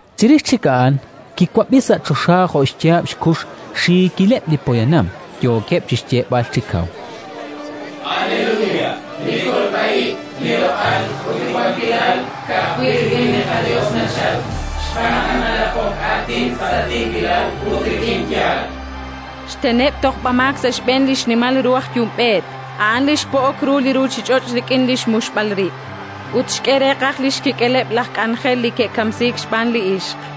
Chirix chik a'an kiwab'i sa' choxa jo' xyaab' xkux xiikileb' li poyanam, yookeb' chi xyeeb'al chi kaw: “Aleluya! Li kolb'a ib', li loq'al ut li wankilal ka'ajwi' rik'in li qaYos nachalk, xb'aan naq naraqok aatin sa' tiikilal ut rik'in yaal: xteneb' tojb'amaak sa' xb'een li xnimal ru aj yumb'eet, a' li xpo'ok ru li ruuchich'och' rik'in li xmuxb'al rib'; ut xk'e reeqaj li xkik'eleb' laj k'anjel li ke'kamsiik xb'aan li ixq”.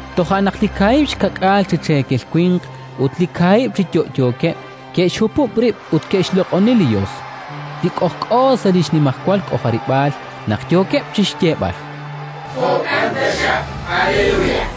Toja' naq li kaahib' xka'k'aal chi cheekel winq ut li kaahib' chi yo'yookeb' ke'xhupub' rib' ut ke'xloq'oni li Yos, li k'ojk'o sa' li xnimajwal k'ojarib'aal, naq yookeb' chi xyeeb'al: “Amén, aleluya!”.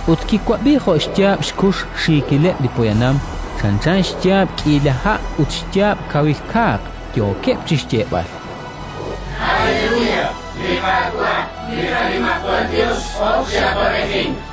Ut kiwab'i jo' xyaab' xkux xiikileb' li poyanam, chanchan xyaab' k'iila ha' ut xyaab' kawil kaaq, yookeb' chi xyeeb'al: “Aleluya! Li Qaawa', li qaNimajwal Yos x'ok chi awab'ejink.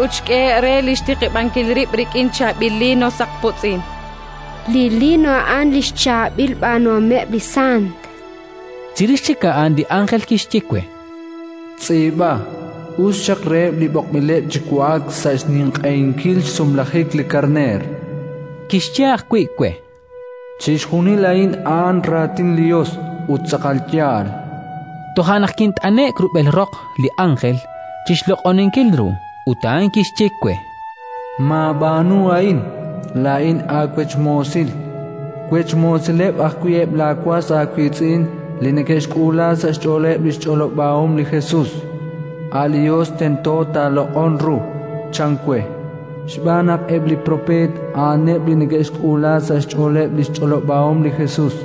ut xk'ehe'k re li xtiqib'ankil rib' rik'in chaab'il liino saqpotz'in”. Li liino a'an li xchaab'il b'aanuhomeb' li sant. Chirix chik a'an li ánjel kixye we: “Tz'iib'a: «Us xaq reheb' li b'oqb'ileb' chi wa'ak sa' xninq'ehinkil xsumlajik li Karneer»”. Kixye ajwi' we: “Chixjunil a'in a'an raatin li Yos ut tz'aqal yaal”. Toja' naq kint'ane'k rub'el roq li ánjel chi xloq'oninkil ru, ut a'an kixye we: “Maab'aanu a'in! Laa'in aawech moosil; wech moosileb' ajwi' eb' laawas aawiitz'in li neke'xk'uula sa' xch'ooleb' li xch'olob'ahom li Jesus. A' li Yos tento taaloq'on ru”, chan we. Xb'aan naq eb' li propeet a'aneb' li neke'xk'uula sa' xch'ooleb' li xch'olob'ahom li Jesus.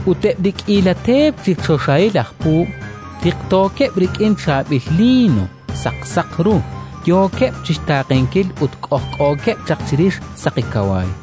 Ut eb' li k'iila teep chi choxahil aj puub' tiqtookeb' rik'in chaab'il liino saqsaq ru, yookeb' chi xtaaqenkil ut k'ojk'ookeb' chaq chirix saqi kawaay.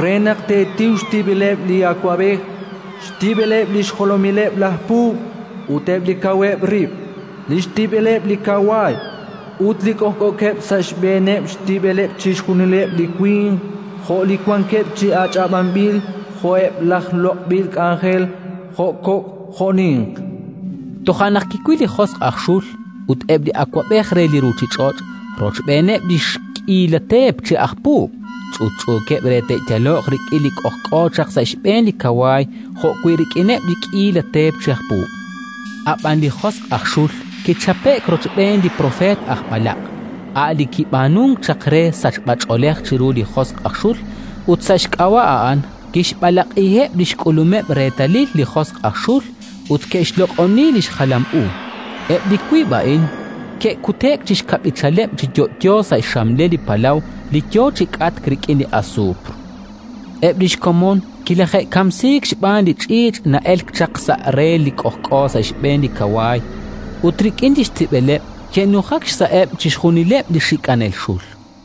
re naq teetiw xtib'eleb' li awab'ej, xtib'eleb' li xjolomileb' laj puub' ut eb' li kaweb' rib', li xtib'eleb' li kawaay ut li k'ojk'ookeb' sa' xb'eeneb', xtib'eleb' chixjunileb' li winq jo' li wankeb' chi ach'ab'anb'il jo'eb' laj loq'b'il k'anjel, jo' kok' jo' ninq”. Toja' naq kiwil li josq' aj xul ut eb' li awab'ej re li ruuchich'och' rochb'eeneb' li xk'iila teep chi aj puub', ch'utch'uukeb' re te'yaloq rik'in li k'ojk'o chaq sa' xb'een li kawaay jo'wi' rik'ineb' li xk'iila teep chi aj puub'. Ab'an li josq' aj xul kichape'k rochb'een li propeet aj b'alaq', a' li kib'aanunk chaq re sachb'ach'oolej chiru li josq' aj xul, ut sa' xk'ab'a' a'an kixb'alaq'iheb' li xk'ulumeb' reetalil li josq' aj xul ut ke'xloq'oni li xjalam u. Eb' li wiib' a'in ke'kute'k chi xkab'ichaleb' chi yo'yo sa' xxamlel li palaw li yo chi k'atk rik'in asuupr. Eb' li xkomon kilaje'kamsiik xb'aan li ch'iich' na'elk chaq sa' re li k'ojk'o sa' xb'een li kawaay; ut rik'in li xtib'eleb' ke'nujak xsa'eb' chixjunileb' li xik'anel xul.